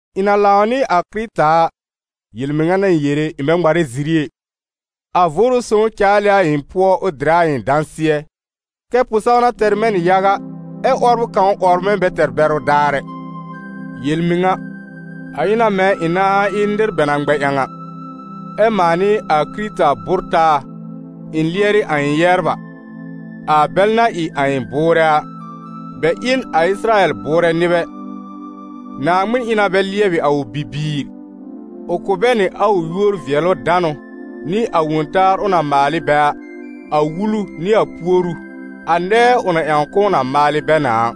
Ɩ̃ na lãw nɩ a Kɩrɩta a, yel-mɩŋa n'a ɩ̃ yere, ɩ̃ bɛ ŋmarɛ ziri ɛ; a Vʋʋrʋ Sõw caal ɩ a ɩ̃ pʋɔ ʋ dɩrɛ a ɩ̃ dãsɩɛ, kɛ́ pʋ-sãwna tɛr mɛ̃ nɩ yaga, ɛ 'wɔbrʋ kãw 'wɔbr mɛ̃ bɛ tɛr bɛrʋ daar ɛ. Yel-mɩŋa, a ɩ na mɛ̃ ɩ̃ nãá ɩ nɩr bɛ na ŋmɛ ƴãw a, ɛ́ mãa nɩ a Kɩrɩta bʋ́r taa ɩ̃ lɩɛrɩ a ɩ̃ yɛbr a, a bɛl na ɩ a ɩ̃ bʋʋrɛ a. Bɛ ɩ n a Ɩsɩrayɛl bʋʋrɛ nɩbɛ: Naaŋmɩn ɩ na bɛ lɩɛbɩ a ʋ bibiir, ʋ kʋ̀ bɛ nɩ a ʋ yúor-vɩɛlʋ-danʋ nɩ a wõ-taar ʋ na maal ɩ bɛ a, a Wulu nɩ a puoru, a nɛɛ ʋ na ƴãw k'ʋʋ na maalɩ bɛ na a.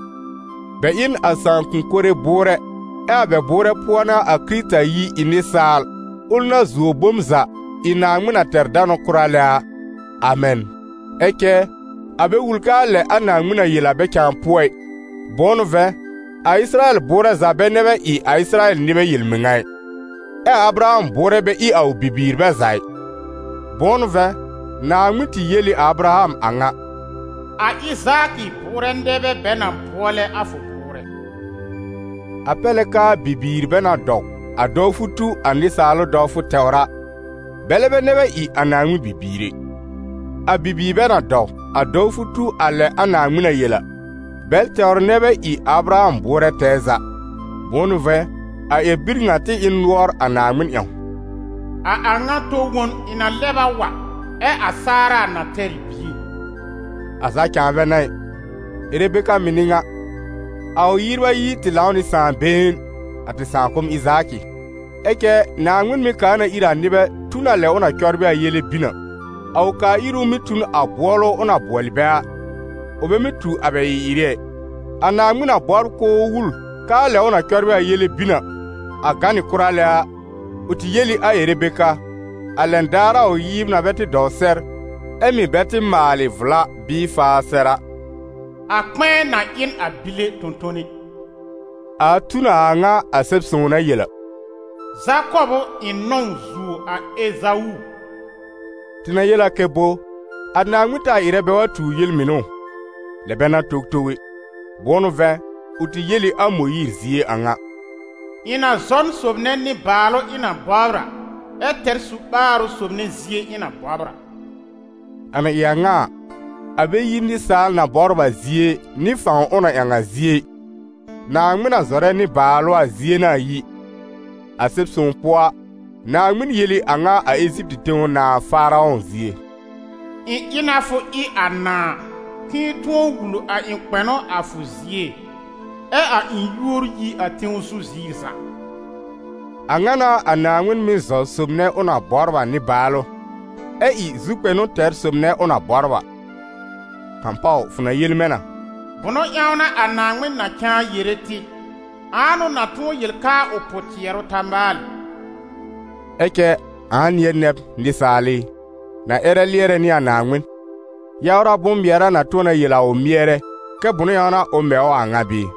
Bɛ ɩ n a sãakʋ̃-kore bʋʋrɛ, ɛ a bɛ bʋʋrɛ pʋɔ n'a a Kɩrɩta yi ɩ nɩsaal, ʋl na zuo bom za, ɩ Naaŋmɩn na tɛr danʋ kʋra lɛ a. Amɛn. Ɛ cɛ, a bɛ wul k'aa lɛ a Naaŋmɩn na yel a bɛ cãa pʋɔ ɩ. Bʋ̃ʋ n'ʋ vɛ̃, a Ɩsɩrayɛl bʋʋrɛ za bɛ nɛ bɛ ɩ a Ɩsɩrayɛl nɩbɛ yel-mɩŋa ɩ. Ɛ a Abraham bʋʋrɛ bɛ ɩ a ʋ bibiir bɛ za ɩ. Bʋ̃ʋ n'ʋ vɛ̃, Naaŋmɩn tɩ yel ɩ a Abraham a ŋa: «A Ɩzaakɩ bʋʋrɛ nɛ bɛ bɛ na bʋɔlɛ a fʋ bʋʋrɛ.» A pɛr lɛ k'aa bibiir bɛ na dɔw a dɔwfʋ tu a nɩsaalʋ dɔwfʋ tɛwr a, bɛlɛ bɛ nɛ bɛ ɩ a Naaŋmɩn bibiir ɛ; a bibiir bɛ na dɔw, a dɔwfʋ tu a lɛ a Naaŋmɩn na yel a, bɛl tɛwr nɛ bɛ ɩ a Abraham bʋʋrɛ tɛɛ za. Bʋ̃ʋ n'ʋ vɛ̃, a ƴɛr-bir ŋa tɩ ɩ n nʋɔr a Naaŋmɩn ƴãw: «A a ŋa tɔ-won ɩ̃ na lɛb a wa, ɛ a Saara na tɛr ɩ bie.» A za cãa bɛ n'a ɩ; Erebeka mɩ̀ n'ɩ ŋa: a ʋ yɩbr ayi tɩ lãw nɩ sãà been, a tɩ sãakʋm Ɩzaakɩ. Ɛ cɛ Naaŋmɩn mɩ́ kaa na ír a nɩbɛ tu n a lɛ ʋ na cɔbrɩ a yele bin a: a ʋ kaa-íru mɩ́ tu n a bʋɔlʋ ʋ na bʋɔlɛ bɛ a, ʋ bɛ mɩ́ tu a bɛ ɩ-ɩrɩ ɛ. A Naaŋmɩn na bɔbr k'ʋʋ wul k'aa lɛ ʋ na cɔbrɩ a yele bin a, a gã nɩ kʋra lɛ a, ʋ tɩ yel ɩ a Erebeka, a lɛn daar a ʋ yɩbr na bɛ tɩ dɔw sɛr, ɛ mɩ̀ bɛ tɩ maalɩ vla bɩɩ faa sɛr a: «A kpɛ̃ɛ na ɩ n a bile tõ-tone.» A tu n a a ŋa a Sɛb-sõw na yel a: «Zakɔb ʋ ɩ̃ nɔ̃w zuo a Ezawu.» Tɩ na yel a kɛ bo? A Naaŋmɩn taa ɩrɛ bɛ wa tuur yel-mɩnʋ ʋ? Lɛ bɛ n'a towtow ɛ! Bʋ̃ʋ n'ʋ vɛ̃, ʋ tɩ yel ɩ a Mõyiir zie a ŋa: «Ɩ̃ na zɔ n sob nɛ nɩ-baalʋ ɩ̃ na bɔbr a, ɛ tɛr su-ɓaarʋ sob nɛ zie ɩ̃ na bɔbr a.» A na ɩ a ŋa a, a bɛ yi nɩsaal na bɔbr a zie, nɩ fãw ʋ na ƴãw a zie ɩ, Naaŋmɩn na zɔrɛ nɩ-baalʋ a zie n'a a yi. A Sɛb-sõw pʋɔ a, Naaŋmɩn yel ɩ a ŋa a Eziptɩ tẽw nãà Faarɔ̃ zie: «Ɩ̃ ɩ na fʋ ɩ a nãà, k'ɩ̃ɩ tʋ̃ɔ wul a ɩ̃ kpɛnʋ a fʋ zie, ɛ a ɩ̃ yúor yi a tẽw zu ziir za.» A ŋa n'a a Naaŋmɩn mɩ́ zɔ sob nɛ ʋ na bɔbr a nɩ-baalʋ, ɛ ɩ zu-kpɛnʋ tɛr sob nɛ ʋ na bɔbr a. Kãpaw fʋ na yel mɛ̃ na: «Bʋnʋ ƴãw n'a a Naaŋmɩn na cãa yere tɩ? Ãa n'ʋ na tʋ̃ɔ yel k'aa ʋ pʋ-tɩɛrʋ ta maalɩ?» Ɛ cɛ ãa nɩ̃ɛ nɛ b, nɩsaal ɩ, na ƴɛrɛ lɩɛrɛ nɩ a Naaŋmɩn? Yawra bʋ̃-mɩɛra na tʋ̃ɔ na yel a ʋ mɩɛrɛ kɛ bʋnʋ ƴãw n'a ʋ mɛ ʋ a a ŋa bɩɩ?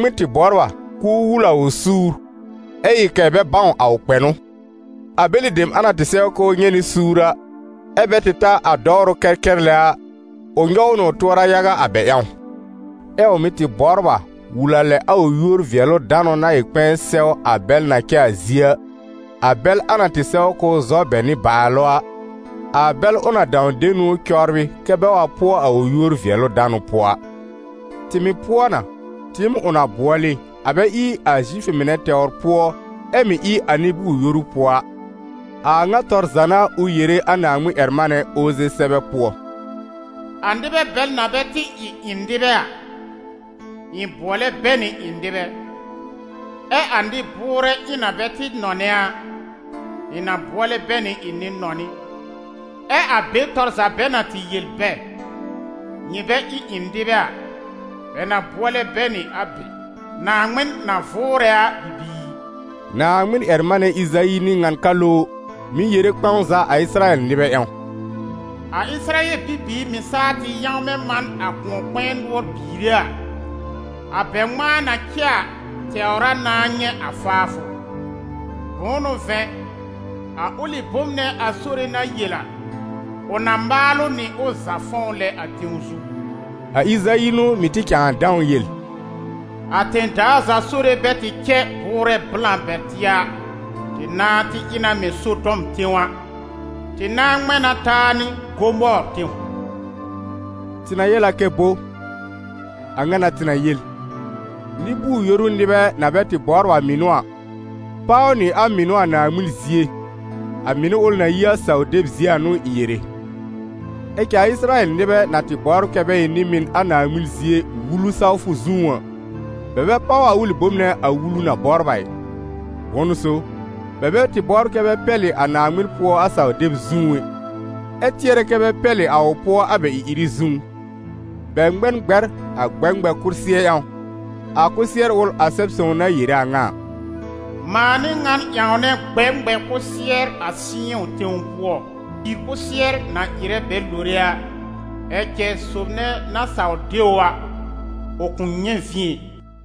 Naaŋmɩn tɩ bɔbr a k'ʋʋ wul a ʋ suur, ɛ ɩ kɛ̀ bɛ bãw a ʋ kpɛnʋ. A bɛlɩ dem a na tɩ sɛw k'ʋʋ nyɛ̃ nɩ suur a, ɛ́ bɛ tɩ ta a dɔwrʋ kɛrkɛr lɛ a, ʋ nyɔw nɩ ʋ tʋɔra yaga a bɛ ƴãw. Ɛ ʋ mɩ̀ tɩ bɔbr a wul a lɛ a ʋ yúor-vɩɛlʋ-danʋ na ɩ kpɛ̃ɛ sɛw a bɛl na cɛ a zie a, a bɛl a na tɩ sɛw k'ʋʋ zɔ bɛ nɩbaalʋ a, a bɛl ʋ na dãw de niwn cɔbrɩ kɛ́ bɛ wa pʋɔ a ʋ yúor-vɩɛlʋ-danʋ pʋɔ a. Tɩ mɩ̀ pʋɔ na, tɩɩm ʋ na bʋɔlɩ, a bɛ ɩ a Zifʋ mɩnɛ tɛwr pʋɔ ɛ mɩ̀ ɩ a nɩ-bʋʋr-yoru pʋɔ a. A a ŋa tɔr za n'a ʋ yere a Naaŋmɩn-ƴɛr-manɛ Oze sɛbɛ pʋɔ: «A nɩbɛ bɛl na bɛ tɩ ɩ ɩ̃ nɩbɛ a, ɩ̃ bʋɔlɛ bɛ nɩ ɩ̃ nɩbɛ, ɛ a nɩ-bʋʋrɛ ɩ̃ na bɛ tɩ nɔnɛ a, ɩ̃ na bʋɔlɛ bɛ nɩ ɩ̃ nɩ-nɔnɩ. Ɛ a be tɔr za bɛ na tɩ yel bɛ: ‹Nyɩ bɛ ɩ ɩ̃ nɩbɛ a›, bɛ na bʋɔlɛ bɛ nɩ a be: ‹Naaŋmɩn na vʋʋrɛ a bibiir.›» Naaŋmɩn-ƴɛr-manɛ Ɩzayi n'ɩ ŋan ka lowr mɩ̀ yere kpɛ̃w za a Ɩsɩrayɛl nɩbɛ ƴãw: «A Ɩsɩrayɛl bibiir mɩ̀ saa tɩ yãwmɛ man a kʋ̃ɔ-kpɛ̃ɛ nʋɔr biire a, a bɛ ŋmãa na cɛ a tɛwr a nãá nyɛ̃ a faafʋ; Bʋ̃ʋ n'ʋ vɛ̃, a ʋlɩ bom nɛ a Sore na yel a, ʋ na maal ʋ nɩ ʋ za fɔ̃w lɛ a tẽw zu.» A Ɩzayi n'ʋ mɩ̀ tɩ cãa dãw yel: «A tẽ-daa za Sore bɛ tɩ cɛ bʋʋrɛ blã bɛr tɩ a, tɩ nãá tɩ ɩ na mɛ̃ Sodɔm tẽw a, tɩ nãá ŋmɛ̃ na taa nɩ Gomɔɔr tẽw.» Tɩ na yel a kɛ bo? A ŋa n'a tɩ na yel: nɩ-bʋʋr-yoru nɩbɛ, na bɛ tɩ bɔbr a mɩnʋ a, páw nɩ a mɩnʋ a Naaŋmɩn zie, a mɩnʋ ʋl na yi a saw-deb zie a n'ʋ ɩ̃ yere; ɛ cɛ a Ɩsɩrayɛl nɩbɛ na tɩ bɔbr kɛ bɛ ɩ nɩ-mɩn a Naaŋmɩn zie, Wulu sawfʋ zũú a, bɛ bɛ páw a ʋlɩ bom nɛ a Wulu na bɔbr a ɩ. Bʋ̃ʋ n'ʋ so? Bɛ bɛ tɩ bɔbr kɛ bɛ pɛlɩ a Naaŋmɩn pʋɔ a saw-deb zũú ɛ, ɛ tɩɛrɛ kɛ bɛ pɛlɩ a ʋ pʋɔ a bɛ ɩ-ɩrɩ zũú. Bɛ ŋmɛ n gbɛr a gbɛ-ŋmɛ-kʋsɩɛr ƴãw, a kʋsɩɛr ʋl a Sɛb-sõw na yere a ŋa a: «Mãa n'ɩ ŋan ƴãwnɛ gbɛ-ŋmɛ-kʋsɩɛr a Sɩyɔ̃ tẽw pʋɔ, pìir kʋsɩɛr na ɩrɛ bɛ lore a. Ɛ cɛ sob nɛ na saw de ʋ a, ʋ kʋ̃ nyɛ̃ vĩ ɛ.»